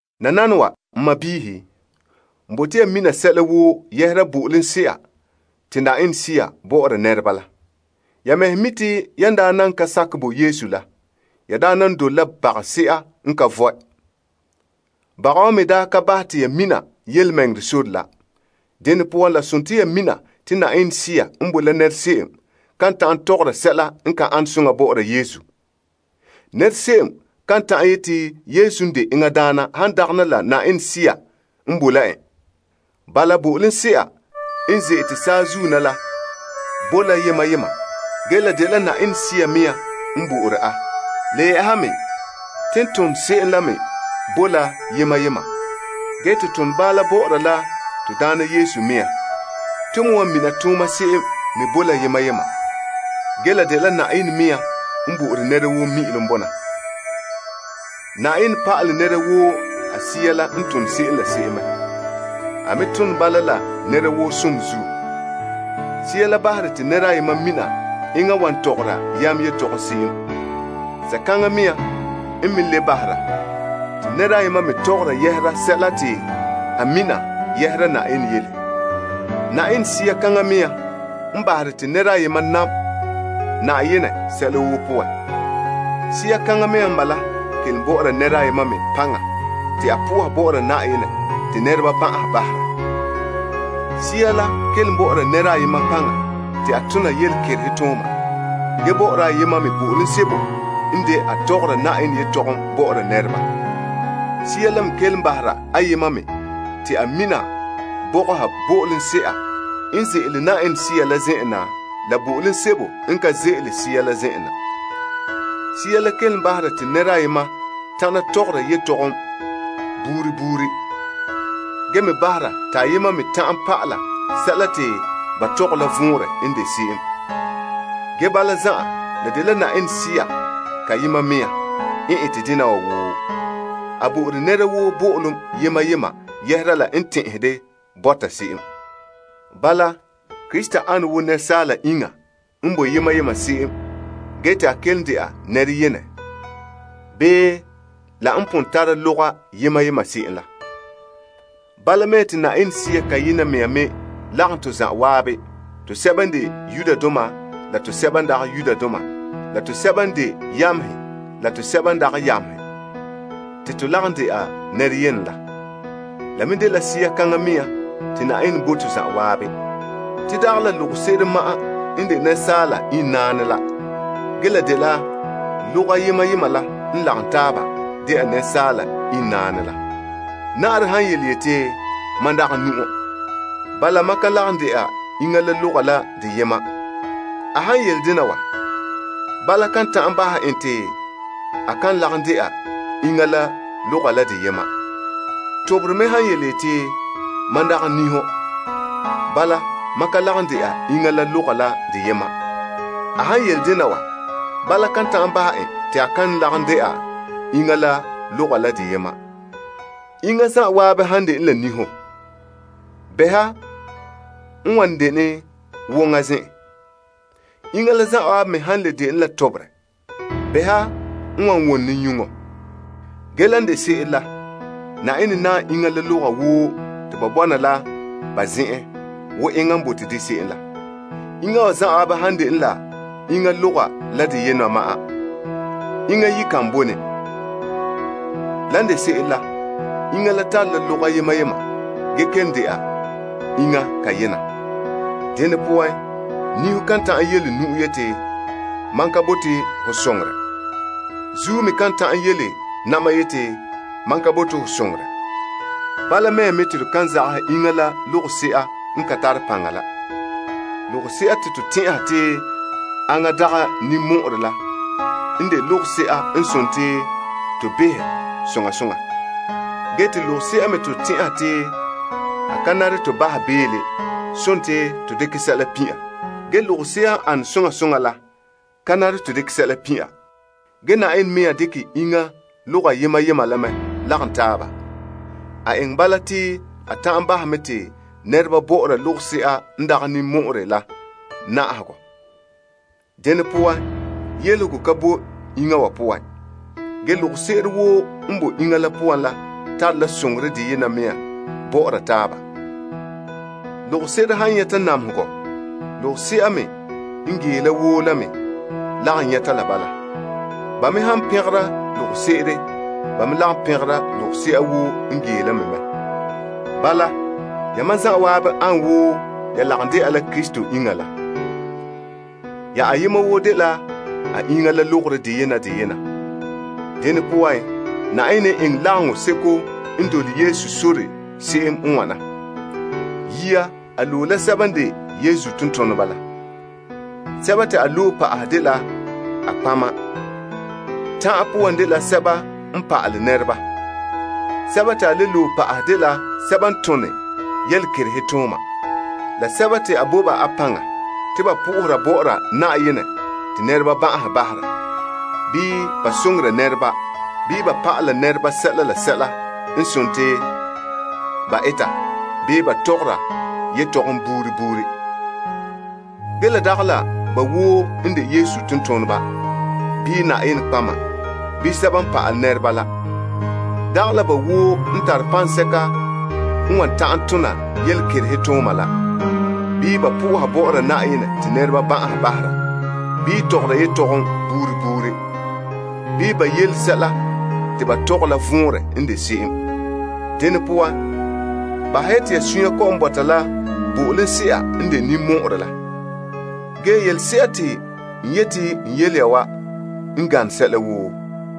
Nananawa, n sɔɔnrɔ, n bote ya mina sɛla woo yɛhera bo'olomse'a te Yenɛ Sea bɔ'ɔra nɛreba la. Ya mɛhe mi' te yan daa nan ka sakɛ bo Yesu la, ya daa nan dole la bagase'a n ka vɔe. Baga wa me daa ka bahɛ te ya mina yelemɛŋɛrɛ sore la. Dene poan, la sontii ya mina te Yenɛ Sea n boe la nɛra se'em kan ta'an tɔgɔra sɛla n ka an soŋa bɔ'ɔra Yesu. Nɛra se'em kan ta'an yete Yesu n de to Daana han dagana la Yenɛ Sea n boe la en. Bala, bo'olomse'a n ze'ete saazuo na la bo la yema yema, ge la dela Yenɛ Sea mea nɔɔ n bo'ore a. Le yɛ'ɛha me, ton tone se'em la me bo la yema yema, ge to tone bala bɔ'ɔra la to Daana Yesu mea me nɔɔ. Ton me wan mina tooma se'em me bo la yema yema. Ge, la dela Na'ayenɛ mea nɔɔ n bo'ore nɛra woo mi'ilom bona. Na'ayenɛ pa'alɛ nɛra woo a Sea la n tone se'em la se'em mɛ. A me tone bala la nɛra woo som zuo. Sea la bahere te nɛra ayema mina enŋa wan tɔgɔra yam yetɔgom se'em. Sea kaŋa mea nɔɔ n me le bahera te nɛra ayema me tɔgɔra yɛhera sɛla te a mina yɛhera Na'ayenɛ yele. Yenɛ Sea kaŋa mea nɔɔ n bahera te nɛra ayema nam Na'ayenɛ sɛla woo poan. Sea kaŋa mea n bala kelom bɔ'ɔra nɛra ayema me paŋa te a po'oha bɔ'ɔra Na'ayenɛ te nɛreba ban'ahe bahera. Sea la kelom bɔ'ɔra nɛra ayema paŋa te a tona yelekerehe tooma gee bɔ'ɔra ayema me bo'olom sebo n de a tɔgɔra Na'ayenɛ yetɔgom bɔ'ɔra nɛreba. Sea la me nɔɔ kelom bahera ayema me te a mina bɔgɔha bo'olomse'a n ze'ele Yenɛ Sea la zen'en na la bo'olomse'a n ka ze'ele Sea la zen'en na. Sea la kelom bahera te nɛra ayema ta'ana tɔgɔra yetɔgom buuri buuri, gee me bahera te ayema me ta'ana pa'ala sɛla te ba tɔgɛ la vɔnrɛ n de se'em. Ge bala zan'an, la dela Yenɛ Sea kayena mea nɔɔ n ete dena wa woo. A bo'ore nɛra woo bo'olom yema yema yɛhera la n tɛn'ɛhɛ de bɔta se'em. Bala Krista ane wo nɛresaala iŋa n bo yema yema se'em gee te a kelom de'a nɛra yenɛ, bii la n pon tara loga yema yema se'em la. Bala mea nɔɔ, te Yenɛ Sea kayena mea me nɔɔ n lagom to zanwaabe tosɛba n de Yudoma la tosɛba n de Greekdoma la tosɛba n de yamehe la tosɛba n dagɛ yamehe te to lagom de'a nɛra yenɛ la. La me dela Sea kaŋa mea nɔɔ te Na'ayenɛ bo to zanwaabe. Te dagɛ la logose'ere ma'an n de nɛresaala iŋnaanɛ la, ge la dela loga yema yema la n lagom taaba de'a nɛresaala iŋnaanɛ la. Na'arɛ han yeti, Mam dagɛ nu'o, bala mam ka lagom de'a iŋa loga la deyema. A han yele dena wa, bala kan ta'an bahɛ en te a kan lagom de'a iŋa la loga la deyema. Toberɛ me han yeti, Mam dagɛ niho, bala mam ka lagom de'a iŋa la loga la deyema. A han yele dena wa, bala kan ta'an bahɛ en te a kan lagom de'a iŋa la loga la deyema. Iŋa zanwaabe han dene la niho, bɛha n wan dene woŋa zen'en? Iŋa la zanwaabe me han le dene la toberɛ, bɛha n wan wone nyuŋo? Ge, lan de se'ere la, Na'ayenɛ naam iŋa la loga woo te ba bɔna la ba zen'en wo enŋa n bote de se'em la. Iŋa wa zanwaabe han dene la enŋa loga la deyena ma'an, iŋa yi kan bo ne. Ge, lan de se'ere la, iŋa la tare la loga yema yema gee kelom de'a iŋa kayena. Dene poan, niho kan ta'an yele nu'o yeti, Mam ka bote ho soŋorɛ. Zuo me kan ta'an yele na'ma yeti, Mam ka bote ho soŋorɛ. Bala mea me nɔɔ, to kan zagahɛ iŋa logose'a n ka tare paŋa la. Logose'a te to tɛn'ɛha te aŋa dagɛ ninmɔ'ɔrɛ la n de logose'a n sontii to behɛ soŋa soŋa. Ge te logose'a me te to tɛn'ɛha te a ka nare to bahɛ beele, sontii to dekɛ sɛla pin' a. Ge logose'a n an soŋa soŋa la ka nare to dekɛ sɛla pin' a. Ge Na'ayenɛ mea dekɛ iŋa loga yema yema la mɛ lagom taaba. A eŋɛ bala te a ta'an bahɛ mɛ te nɛreba behɛ logose'a n dagɛ ninmɔ'ɔrɛ la soŋa soŋa. Dene poan, yelehego ka bo iŋa wa poan. Ge, logose'ere woo n bo iŋa la poan la tare la soŋorɛ deyena mea nɔɔ bɔ'ɔra taaba. Logose'ere han nyɛta namehegɔ, logose'a me n gee la woo la me lagom nyɛta la bala. Ba me han pɛngera logose'ere, ba me lagom pɛngera logose'a woo n gee la me mɛ. Bala, yamam zanwaabe an wo ya lagom de'a la Krista iŋa la. Ya ayema woo dela a iŋa la logorɛ deyena deyena. Dene poan, Na'ayenɛ n eŋɛ lagaŋseko n dole Yesu sore se'em n wana. Yia a loe la sɛba n de Yesu tontoneba la. Sɛba te a loe pa'ahɛ dela a nɔtɔgɔheba. Ta'an poan dela sɛba n pa'alɛ nɛreba. Sɛba te a le loe pa'ahɛ dela sɛba n tone yelekerehe tooma, la sɛba te a bo ba a paŋa te ba po'ohera bɔ'ɔra Na'ayenɛ te nɛreba ban'ahe bahera, bii ba soŋora nɛreba, bii ba pa'ala nɛreba sɛla la sɛla n sontii ba eta bii ba tɔgɔra yetɔgom buuri buuri. Ge la dagɛ la ba woo n de Yesu tontoneba, bii nɔtɔgɔheba, bii sɛba n pa'alɛ nɛreba la. Dagɛ la ba woo n tare paŋsɛka n wan ta'an tona yelekerehe tooma la, bii ba po'ohera bɔ'ɔra Na'ayenɛ te nɛreba ban'ahe bahera, bii tɔgɔra yetɔgom buuri buuri, bii ba yele sɛla te ba tɔgɛ la vɔnrɛ n de se'em. Dene poan, bahɛ ya te ya sunya kɔ'ɔn bɔta la bo'olomse'a n de ninmɔ'ɔrɛ zo'e zo'e la. Ge, yelese'a te n yete n yele ya wa n gane sɛla woo.